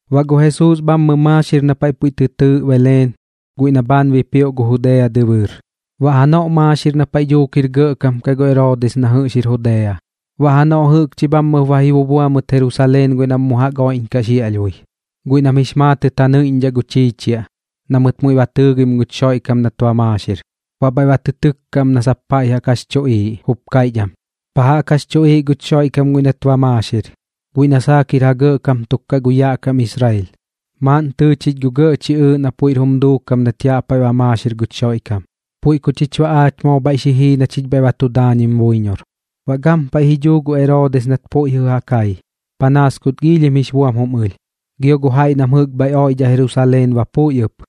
Baꞌ gu Jesuus bhammɨ maaxir na paiꞌ puiꞌ tɨ tɨɨꞌ Beleen guiꞌ na bhaan bipioꞌ gu Judea dɨbɨɨr, baꞌ janoꞌ maaxir na paiꞌ dhuuk jir gɇꞌkam kaꞌ gu Eroodis na jɨꞌx jir Judea. Baꞌ janoꞌ jɨꞌkchi bhammɨp ba ji bubua mɨt Jerusaleen guiꞌ nam mu jaꞌk oiꞌñkaꞌ xiaꞌlhbui, guiꞌ nam jix maatɨt ja nɨiꞌñdhaꞌ gu chiichiaꞌ, na mɨt muiꞌ ba tɨɨgim guch Xoiꞌkam nat ba maaxir. Baꞌ bhaiꞌ ba tɨ tɨkka am na sap pa jaꞌk jax chuꞌiiꞌ, jup kaiꞌch am: ―¿Pa jaꞌk jax chuꞌiiꞌ guch Xoiꞌkam guiꞌ nat ba maaxir, guiꞌ na saak jir ja gɇꞌkam tuk kaꞌ gu yaꞌ kam dhi Israel? Maaꞌn tɨɨ chich gu gɇꞌ chiꞌɨɨꞌ na puiꞌr jum duukam nat yaꞌ paiꞌ ba maaxir guch Xoiꞌkam. Puiꞌ ku chich baꞌ aach moo bhaiꞌ xi jii na chich bhaiꞌ bha tu daañim buiñor. Baꞌ gampaiꞌ ji dhuu gu Eroodis nat puiꞌ jɨꞌ ja kai, panaas kut giilhim jix buam jum ɨlh, gio gu jaiꞌ nam jɨꞌk bhaiꞌ oiꞌdhaꞌ Jerusaleen ba puiꞌ ɨp.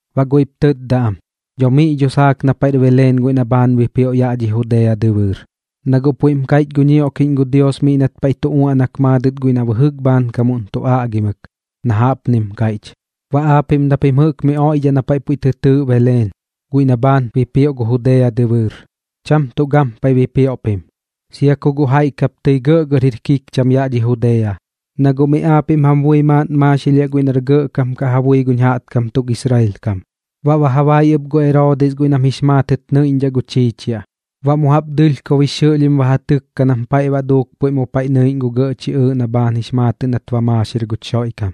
Baꞌ guiꞌp tɨtda am: ―Dho miꞌ dho saak na paiꞌr Beleen guiꞌ na bhaan bipioꞌ yaꞌ dhi Judea dɨbɨɨr, na guꞌ puiꞌm kaiꞌch gu ñioꞌkiꞌñ gu Dios miꞌ nat paiꞌ tu uaꞌnak maadɨt guiꞌ nam bɨjɨk bhaankamuꞌn tu aꞌgimɨk, na jaꞌpnim kaiꞌch: Baꞌ aapiꞌm na pim jɨꞌk miꞌ oiꞌdhaꞌ na paiꞌ puiꞌ tɨ tɨɨꞌ Beleen, guiꞌ na bhaan bipioꞌ gu Judea dɨbɨɨr, cham tuꞌ gampaiꞌ bipioꞌ pim, sia ku guꞌ jaiꞌ kap tɨi gɇꞌgɇr jir kikcham yaꞌ dhi Judea, na guꞌ miꞌ aapiꞌm jam bui maaꞌn maaxilhiaꞌ guiꞌ nar gɇꞌkam kaꞌ ja bui guñ jaꞌtkam tuk Israel kam. Baꞌ ba ja bai ɨp gu Eroodis guiꞌ nam jix maatɨt nɨiꞌñdhaꞌ gu chiichiaꞌ, baꞌ mu jaꞌp dɨlhkob jix xɨꞌlhim ba ja tɨkka nam paiꞌ baꞌ duuk mu paiꞌ pu nɨiꞌñ gu gɇꞌ chiꞌɨɨꞌ na bhaan jix maatɨꞌ nat ba maaxir guch Xoiꞌkam.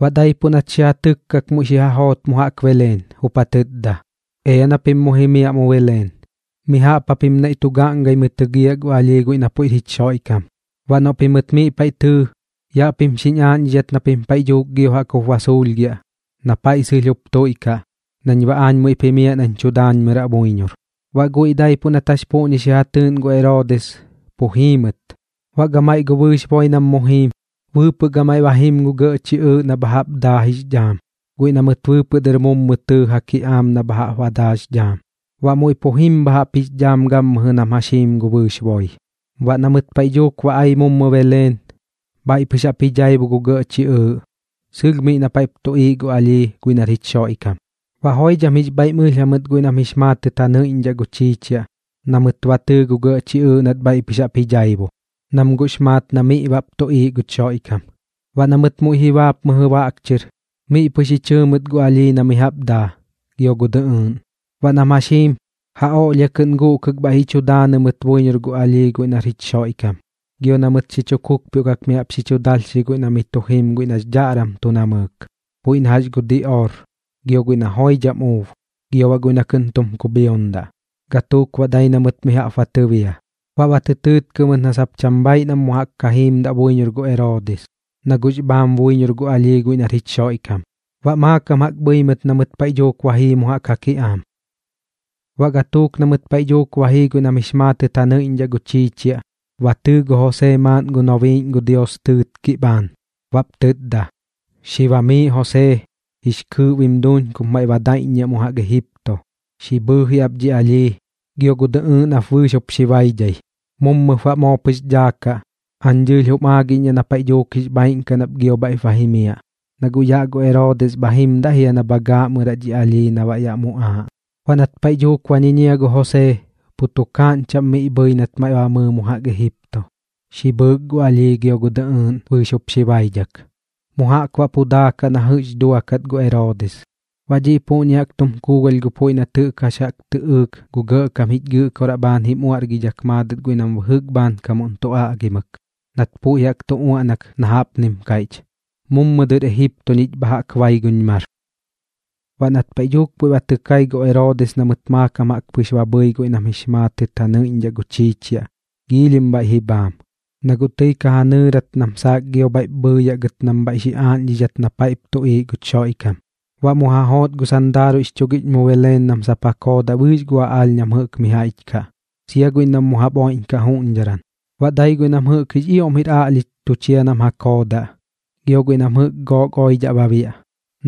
Baꞌ daipuꞌ nat xi ja tɨkkak muiꞌ xi ja joot mu jaꞌk Beleen, jup ja tɨtda: ―Ea na pim mu jimiaꞌ mu Beleen. Mi jaꞌp japim naiꞌ tu gaaꞌngɨmɨi tɨgiaꞌ gu alhii guiꞌ na puiꞌr jich Xoiꞌkam. Baꞌ noꞌ pimɨt miꞌ paiꞌ tɨɨ, yaꞌ pim xiñ aaꞌñdhidhat na pim paiꞌ dhuuk gio jaꞌk jup ba suulhgiaꞌ na paiꞌ sɨlh jup tuiꞌkaꞌ, nañ baꞌ aañ muiꞌp jimiaꞌ nañ tu daañmɨraꞌ buiñor. Baꞌ guiꞌ daipuꞌ nat jax puꞌñi xi ja tɨɨꞌn gu Eroodis, pu jii mɨt. Baꞌ gamaiꞌ gu bɨɨx boi nam mu jiim, bɨɨpɨꞌ gamaiꞌ ba jim gu gɇꞌ chiꞌɨɨꞌ bha jaꞌp jix dhaam, guiꞌ na mɨt bɨɨpɨꞌ dɨr mummɨ jaꞌk tɨɨ ja kiꞌaam na bha jaꞌp daa jix dhaam, baꞌ muiꞌ pu jim bha jaꞌp jix dhaam gammɨjɨ nam jax jiim gu bɨɨx boi. Baꞌ na mɨt paiꞌ dhuuk ba ai mummɨ Beleen, bhaiꞌ pɨx jaꞌp ji dhaibu gu gɇꞌ chiꞌɨɨꞌ sɨlh miꞌ na paiꞌp tuꞌiiꞌ gu alhii guiꞌ nar jich Xoiꞌkam. Baꞌ joidham jix bhaiꞌm ɨlh jamɨt guiꞌ nam jix maatɨt ja nɨiꞌñdhaꞌ gu chiichiaꞌ na mɨt ba tɨɨ gu gɇꞌ chiꞌɨɨꞌ nat bhaiꞌ pɨx jaꞌp ji dhaibu, nam guꞌx maat na miꞌ bap tuꞌiiꞌ guch Xoiꞌkam. Baꞌ na mɨt muiꞌ ji baap mɨjɨ baꞌk chɨr, miꞌ pɨx ji chɨɨ mɨt gu alhii na mi jaꞌp daa, gio gu dɨꞌɨɨꞌn. Baꞌ nam jax jiim, ja oꞌlhia kɨꞌn guꞌkɨk bhaiꞌ ji chu daanɨ mɨt buiñor gu alhii guiꞌ nar jich Xoiꞌkam, gio na mɨt xi chu kukpioꞌkak mi jaꞌp xi chu dalhxi guiꞌ na miꞌ tu jim guiꞌ nax dhaꞌram tu namɨɨk, puiꞌ na jax gu diꞌoor, gio guiꞌ na joidham uub, gio baꞌ guiꞌ na kɨꞌn tum kubhiondaꞌ. Gatuuk baꞌ dai na mɨt mi jaꞌp ba tɨbia. Baꞌ ba tɨ tɨɨtkɨ mɨt na sap cham bhaaiꞌ nam mu jaꞌk ka jiimdaꞌ buiñor gu Eroodis, na guꞌx bhaam buiñor gu alhii guiꞌ nar jich Xoiꞌkam. Baꞌ maakam jaꞌk bhɨi mɨt na mɨt paiꞌ dhuuk ba jii mu jaꞌk ja kiꞌaam. Baꞌ gatuuk na mɨt paiꞌ dhuuk ba jii guiꞌ nam jix maatɨt ja nɨiꞌñdhaꞌ gu chiichiaꞌ, ba tɨɨ gu Josee maaꞌn gu nobiiꞌñ gu Dios tɨɨtkiꞌ bhaan, baꞌp tɨtda: ―Xi bamiiꞌ Josee, jix kɨɨꞌ bim duuñ kup maiꞌ daiꞌññiaꞌ mu jaꞌk Ejipto, xi bhɨɨji ap dhi alhii, gio gu dɨꞌɨɨꞌn jap bɨɨx jup xi baidhai. Mummɨp baꞌ moo pɨx daakaꞌ, aañ dɨɨlh bam aagiꞌñdhaꞌ na paiꞌ dhuuk jix bhaaiꞌn kaꞌ nap gio bhaiꞌp ba jimiaꞌ, na guꞌ yaꞌ gu Eroodis bha jimdaꞌ jia na bha gaaꞌmɨraꞌ dhi alhii na baꞌ yaꞌ muꞌaaꞌ. Baꞌ nat paiꞌ dhuuk ba ñiñia gu Josee, pu tukaaꞌñ chaꞌm miꞌ bhɨi nat maiꞌ ba mɨɨ mu jaꞌk Ejipto, xi bhɨɨk gu alhii gio gu dɨꞌɨɨꞌn bɨɨx jup xi baidhak. Mu jaꞌk baꞌ pu daakaꞌ na jɨꞌx duakat gu Eroodis. Baꞌ dhiꞌ puꞌñi jaꞌk jum kuugalh gu puiꞌ nat jax jaꞌk tɨꞌɨɨk gu Gɇꞌkam jich Gɨꞌkoraꞌ bhaan jim uaꞌrgidhak maadɨt guiꞌ nam bɨjɨk bhaankam tu aꞌgimɨk, nat puiꞌ jaꞌk tu uaꞌnak na jaꞌpnim kaiꞌch: “Mummɨ dɨr Ejipto ñich bha jaꞌk bai guñ mar.” Baꞌ nat paiꞌ dhuuk puiꞌ ba tɨ kai gu Eroodis na mɨt maakam jaꞌk pɨx ba bhɨi guiꞌ nam jix maatɨt ja nɨiꞌñdhaꞌ gu chiichiaꞌ, giilhim bhaiꞌ ji bhaam, na guꞌ tɨi ka ja nɨɨrat nam saak gio bhaiꞌ bhɨɨyaꞌ gɨt nam bhaiꞌ xi aaꞌñdhidhaꞌ gɨt na paiꞌp tuꞌiiꞌ guch Xoiꞌkam. Baꞌ mu ja joot gu sandaaruiꞌx chugiꞌñ mu Beleen nam sap ja koodaꞌ bɨɨx gu aꞌaalh nam jɨꞌk miꞌ jaiꞌch kaꞌ, sia guiꞌ nam mu jaꞌp oiꞌñkaꞌ juꞌñdharan. Baꞌ dai guiꞌ nam jɨꞌk jix ioꞌm jir aꞌlhich tu chia nam ja koodaꞌ, gio guiꞌ nam jɨꞌk gook oidhaꞌ ba biaꞌ,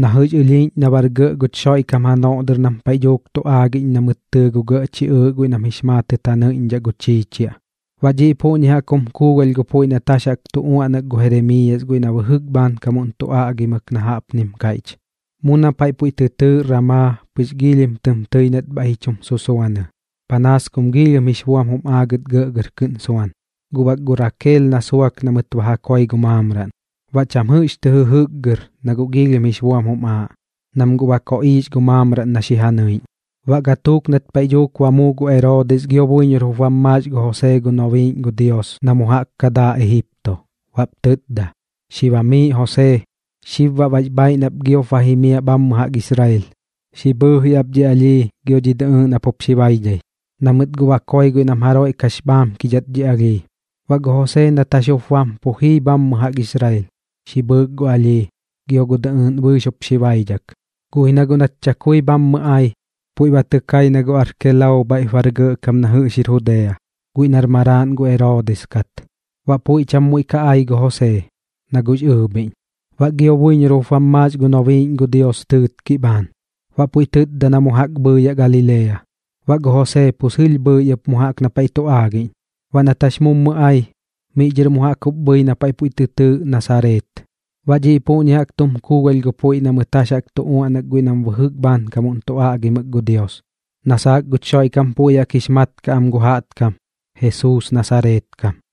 na jɨꞌx ɨlhiiꞌñ na bar gɇꞌ guch Xoiꞌkam janoꞌ dɨr nam paiꞌ dhuuk tu aagiꞌñ na mɨt tɨɨ gu gɇꞌ chiꞌɨɨꞌ guiꞌ nam jix maatɨt ja nɨiꞌñdhaꞌ gu chiichiaꞌ. Baꞌ dhiꞌ puꞌñi jaꞌk jum kuugalh gu puiꞌ nat jax jaꞌk tu uaꞌnak gu Jeremiiyas guiꞌ na bɨjɨk bhaankamuꞌn tu aꞌgimɨk na jaꞌpnim kaiꞌch: Mu na paiꞌ puiꞌ tɨ tɨɨꞌ Ramaa pɨx giilhim tɨm tɨi nat bhaiꞌ ji chum susuanɨ, panaas kum giilhim jix buam jum aagɨt gɇꞌgɇr kɨꞌn suan, guꞌ bak gu Rakeel na suak na mɨt ba ja koi gu maamraꞌn. Baꞌ cham jɨꞌx tɨ jɨjɨkgɨr na guꞌ giilhim jix buam jum aaꞌ, nam guꞌ ba koꞌiix gu maamraꞌn na xi ja nɨiꞌñ. Baꞌ gatuuk nat paiꞌ dhuuk ba muu gu Eroodis gio buiñor jup bam maax gu Josee gu nobiiꞌñ gu Dios na mu jaꞌk ka daa Egipto, baꞌp tɨtda: ―Xi bamiiꞌ Josee. Xib baꞌ bax bhaaiꞌ nap giop ba jimiaꞌ bhammɨ jaꞌk Israel, xi bhɨɨji ap dhi alhii gio dhi dɨꞌɨɨꞌn jap bɨɨx jup xi baidhai, na mɨt guꞌ ba koi guiꞌ nam jaroiꞌ kax bhaamkidhat dhi alhii. Baꞌ gu Josee nat jax jup bam pu jii ɨp bhammɨ jaꞌk Israel, xi bhɨɨk gu alhii, gio gu dɨꞌɨɨꞌn bɨɨx jup xi baidhak. Guꞌ ji na guꞌ nat chakui bhammɨ ai, puiꞌ ba tɨ kai na gu Arkelao bhaiꞌp bar gɇꞌkam na jɨꞌx jir Judea, guiꞌ nar maraaꞌn gu Eroodis kat. Baꞌ puiꞌ cham muiꞌ ka ai gu Josee, na guꞌx ɨɨbhiꞌñ. Baꞌ gio buiñor jup bam maax gu nobiiꞌñ gu Dios tɨɨtkiꞌ bhaan, baꞌ puiꞌ tɨtda na mu jaꞌk bhɨɨyaꞌ Galilea. Baꞌ gu Josee pu sɨlh bhɨi ɨp mu jaꞌk na paiꞌ tu aagiꞌñ. Baꞌ nat jax mummɨ ai, miꞌ dhɨr mu jaꞌk jup bhɨi na puiꞌ tɨ tɨɨꞌ Nasareet. Baꞌ dhiꞌ puꞌñi jaꞌk jum kuugalh gu puiꞌ na mɨt jax jaꞌk tu uaꞌnak guiꞌ nam bɨjɨk bhaankam tu aꞌgimɨk gu Dios, na saak guch Xoiꞌkam puiꞌ jaꞌk jix mat kaꞌ am gu jaꞌtkam: Jesuus Nasareet kam.